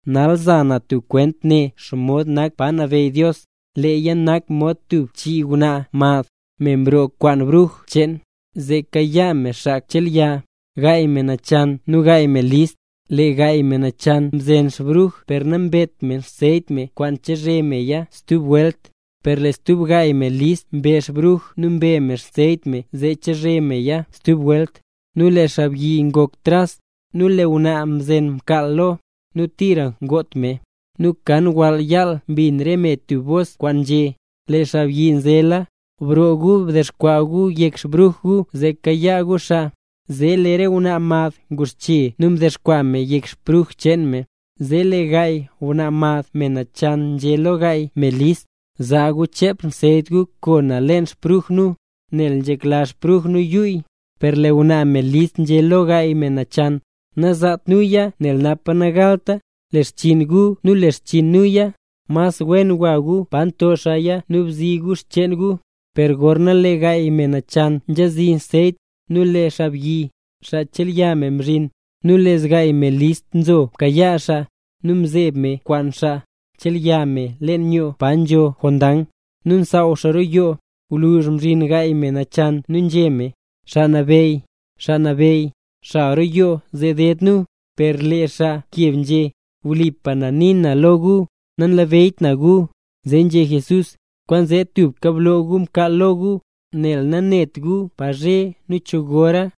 ’Nal za na tub kwent nen xomod nak pa nabeyy Dios. Leeya nak mod tub chii ngwnaa mad, me mroo kwaan bruj cheen, zee kayaa me xaa chelya. Gaay me nachan nu gaay me list. Lee gaay me nachan mzen xbruj per nambet me anseyt kwaan chezhe meya stub welt. Per lee stub gaay me list mbe xbruj nu mbe me anseyt cheen me zee chezhe meya stub welt. Nu lee xaabyi ngok tras, nu lee re ngwnaa mzen mkaal lo, nu tira ngot me. Nu kan wall yaal mbin re me tub bos kwaan nzhé: “Lee xaabyi nzela, broo gu, dexkwaa gu yek xbruj gu zee kayaa gu xaa”. Zee lee re ngwnaa mad nguxche nu mdexkwaa me yek bruj cheen me. Zee lee gaay ngwnaa mad, me nachan, nzhé lo gaay me list: “Zaa gu chep anseyt gu koo nu leen xbruj nu, nel nzhekla xbruj nu yuyy”. Per lee ngwnaa me list nzhé lo gaay me nachan: “Nazaat nuya nel napa nagalta le xchiin guya nu le xchiin nuya, mas wen gwa gu pa nto xaaya nu bzi gu xcheen gu”. Per gorna lee gaay me nachan nzhazi anseyt, nu lee xaabyi, xaa chelya me mzhin, nu lee zgaay me listla mzo mkayaa xaa, nu mzeeb me kwaan xaa chelya me leen yoo pa nzho jondang. Nu msaaw xaa roo yoo. Gwluzh mzhin gaay me nachan nu nzhé me: “Xaa nabeyy, xaa nabeyy, xal roo yoo zee deed nu”. Per lee xaa mkeb nzhé: “Wlipa na nii na lo gu, nanlabeyy na gu”. Zee nzhé Jesús: —Kwaanzee tubka bloo gu mkaal lo gu, nel nanet gu pa zhe nu cho gora.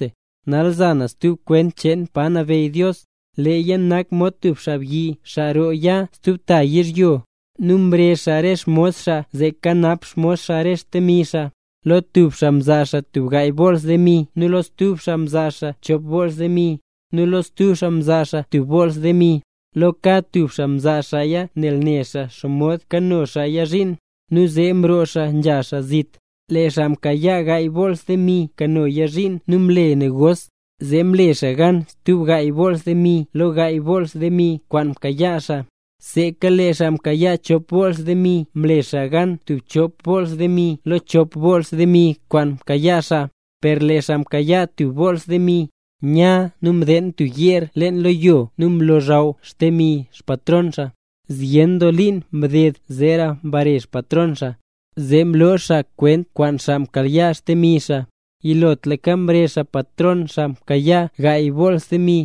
’Nal zan stub kwent cheen pa nabeyy Dios. Leeya nak mod tub xaabyi xaa roo ya stub ta yizhyo. Nu mrezh xaa re xmos xaa zee kanap xmos xaa re xdemi xaa. Lo tub xaa mzaa xaa gaay bools demi nu lo stub xaa mzaa xaa chop bools demi, nu lo stub xaa mzaa xaa tub bools demi, lo kad tub xaa mzaa xaaya nel ne xaa xomod kano xaaya zhiin. Nu zee mroo xaa nzha xaa zit. Lee xaa mkayaa gaay bools demi mkanoya zhiin nu mle negos, zee mle xaa gan stub gaay bools demi lo gaay bools demi kwaan mkayaa xaa. Seeka lee xaa mkayaa chop bools demi mle xaa gan stub chop bools demi lo chop bools demi kwaan mkayaa xaa. Per lee xaa mkayaa tub bools demi, nya nu mdeen tub yeer lo yo nu mlozhaw xdemi xpatron xaa. ’Zyen doo liin mded zeera mbare xpatron xaa, zee mloo xaa kwent kwaan xaa mkayaa xdemi xaa. Yilotlaka mrezh patron xaa mkayaa gaay bools demi,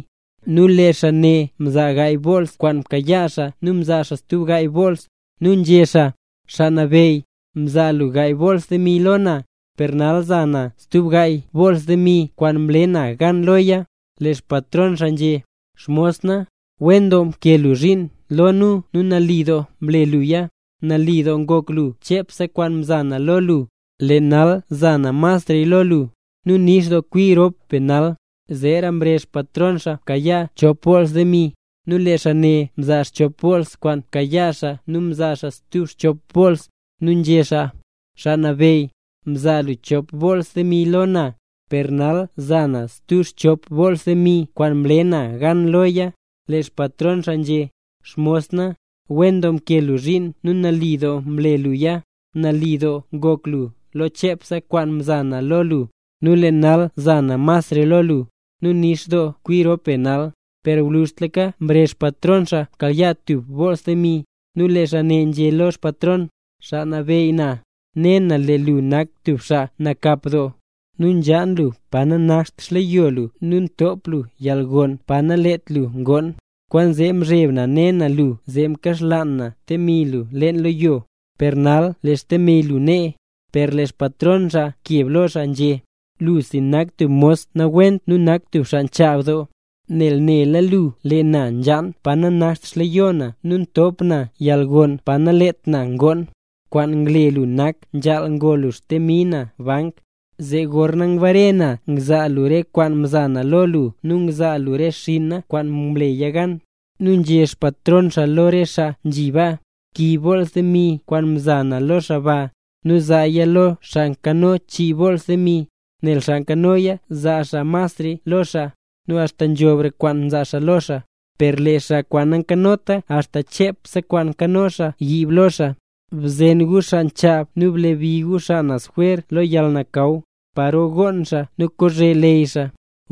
nu lee xaa ne mzaa gaay bools kwaan mkayaa xaa nu mzaa stub gaay boolsa. Nu nzhé xaa: “Xaa nabeyy, mzaa lu gaay bools demi lo na, per nal za na stub gaay bools demi kwaan mle na gan loya”. Lee xpatron xaa nzhé: “Xmos na, wen doo mkee lu zhiin nu nali doo mle luya. Nali doo ngok lu lo chepse kwaan mza na lo lu, lee nal za na masra lo lu. Nu nix doo kwi rop be nal.” Zeera mrezh patron xaa mkayaa chop bools demi, nu lee xaa ne mzaa chop bools kwaan mkayaa xaa nu mzaa stub chop boolsa. Nu nzhé xaa: “Xaa nabeyy, mzaa lu chop bools demi lo na, per nal za na stub chop bools demi kwaan mle na gan loya”. Lee xpatron xaa nzhé: “Xmos na, wen doo mkee lu zhiin nu nali doo mle luya. Nali doo ngok lu lo chepse kwaan mza na lo lu, nu lee nal za na masra lo lu. Nu nix doo kwi rop be nal.” ’Per gwluzhtlaka mrezh patron xaa mkayaa tub bools demi, nu lee xaa ne nzhé lo xpatron: “Xaa nabeyy na, ne na lee lu nak tub xaa nakap doo, nu nzhaan lu pa nanakt xleyo lu nu ntop lu yalgon pa naleet lu ngoon. Kwaanzee mzheb na ne na lu zee mkaxlaan na xdemi lu leen lo yo. Per nal lee xdemi lu nee.” Per lee xpatron xaa mkeb lo xaa nzhé: “Lusi nak tub mos nawent nu tub xaa nchaab doo, nel néla lu, lee na nzhaan pa nanakt xleyo na nu ntop na yalgon pa naleet na ngoon. Kwaan ngle lu nak nzhaal ngo lu xdemi na bank, zee gorna ngbare na ngzaa lu re kwaan mzaa na lo lu nu ngzaa lu re xinna kwaan mleya gan.” Nu nzhé xpatron xaa lo re xaa: “Kiib bools demi kwaan mza na lo xaa ba, nu zaaya lo xaa nkano chii bools demi. Nel xaa nkanoya zaa xaa masraya lo xaa, nu axta nzhobre kwaan zaa xaa lo xaa. Per lee xaa kwaan nankanota axta chep kwaan nkano xaa yiib lo xaa. Bzen gu xaa nchaab nu blebi gu xaa naz jwer lo yalnakaw, paro gonn xaa nu kozhe leyy xaa.”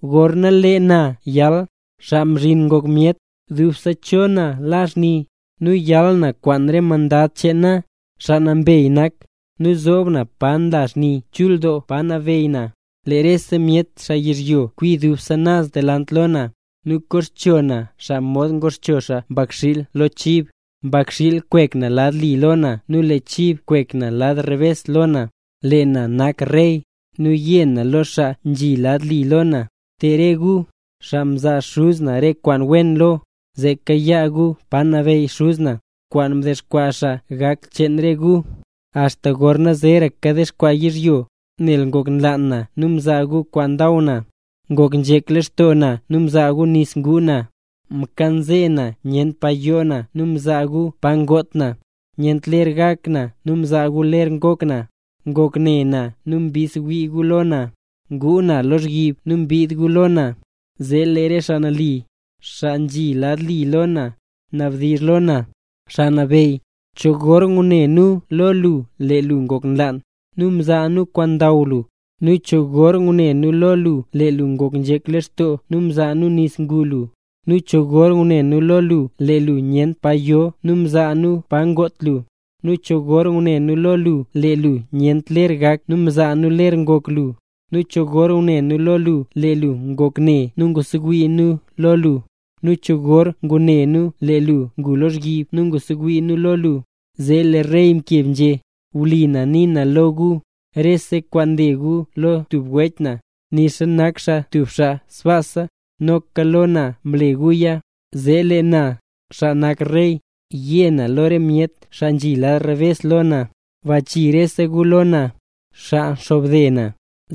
’Gorna lee na yal, Xaa Mzhin Ngok Myet, dubse cho na la xni, nu yal na kwaan re mandad cheen na, xaa nambey nak. Nu zoob na pa nla xni chul doo pa nabeey na. Lee rese myet xaa yizhyo kwi dubse naz delant lo na, nu koxcho na xaa, modxa ngoxcho xaa mbakxiil lo chib. Mbakxiil kwek na lad li lo na nu lee chib kwek na lad rebes lo na. Lee na nak Rey, nu yé na lo xaa nzhi lad li lo na: “Te re gu, xaa mzaa Xuz na re kwaan wen lo, zee kayaa gu pa nabeyy Xuz na, kwaan mdexkwaa xaa gak cheen re gu, axta gorna zeeraka dexkwaa yizhyo. Nel ngok nlaan na nu mzaa gu kwaan ndaw na, ngok nzhek lextoo na nu mzaa gu nis nguu na, mkanze na nyent pa yoo na nu mzaa gu pa ngot na, nyent ler gak na nu mzaa gu ler ngok na, ngok ne na nu mbidsewii gu lo na, ngu na lozhyib nu mbid gu lo na.” Zee lee re xaa nali, xaa nzhi lad li lo na, nabdizh lo na: “Xaa Nabeyy, ¿cho gor ngune nu lo lu lee lu ngok nlaan, nu mzaa nu kwaan ndaw lu? ¿Nu cho gor ngune nu lo lu lee lu ngok nzhek lextoo nu mzaa nu nis ngu lu? ¿Nu cho gor ngune nu lo lu lee lu nyent pa yo nu mzaa nu pa ngot lu? ¿Nu cho gor ngune nu lo lu lee lu nyent ler gak nu mzaa nu ler ngok lu? ¿Nu cho gor ngune nu lee lu ngok ne nu mbidsewii nu lo lu, nu cho gor ngune nu lee lu ngu lozhyib nu mbidsewii nu lo lu?” Zee lee Rey keb nzhé: “Wlipa na nii na lo gu, rese kwaan mle gu lo tub wech na, nixa nak xaa tub xaa sbaasa, noka lo na mle guya”. ’Zee lee na, xaa nak Rey, yé na lo re myet xaa kwaan nzhi lad rebes lo na: “Bachii rese gu lo na, xaa nxobde na.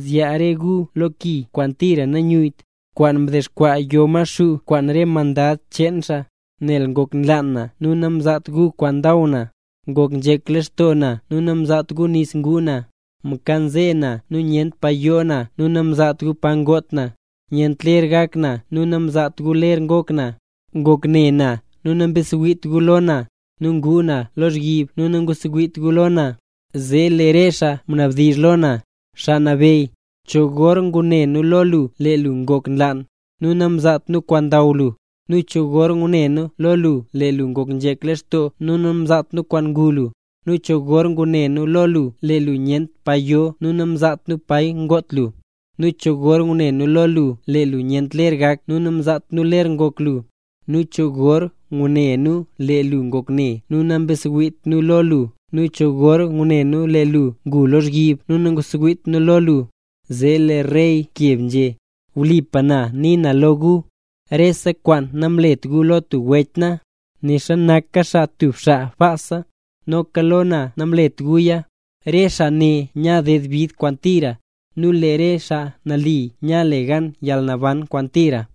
Zyaa re gu lo ki kwaan tira nayuyyt, kwaan mdexkwaa yo Maxuu kwaan re mandad cheen xaa. Nel ngok nlaan na nu namzaat gu kwaan ndaw na, ngok nzhek lextoo na nu namzaat gu nis nguu na. Mkanze na nu nyent pa yoo na nu namzaat gu pa ngot na. Nyent ler gak na nu namzaat gu ler ngok na, ngok ne na nu nambidsewiit gu lo na, nu ngu na lozhyib nu nambidsewiit gu lo na.” Zee lee re xaa nabdizh lo na: “Xaa Nabeyy, ¿cho gor ngune nu lo lu lee lu ngok nlaan, nu namzaat nu kwaan ndaw lu? ¿Nu cho gor ngune nu lo lu lee lu ngok nzhek lextoo nu namzaat nu nis ngu lu? ¿Nu cho gor ngune nu lo lu lee lu nyent pa yo nu namzaat nu pa ngot lu? ¿Nu cho gor ngune nu lo lu lee lu nyent ler gak nu namzaat nu ler ngok lu? ¿Nu cho gor ngune nu lee lu ngok ne nu nambidsewiit nu lo lu nu cho gor ngune nu lee lu ngu lozhyib nu nambidsewiit nu lo lu?” Zee lee Rey keb nzhé: “Wlipa na nii na lo gu, rese kwaan namlet gu lo tub wech na, nixa nak xaa tub xaa sbaasa, noka lo na namlet guya”. Re xaa ne nya ded bid kwaan tira, nu lee re xaa nali nya le gan yalnaban kwaan tira.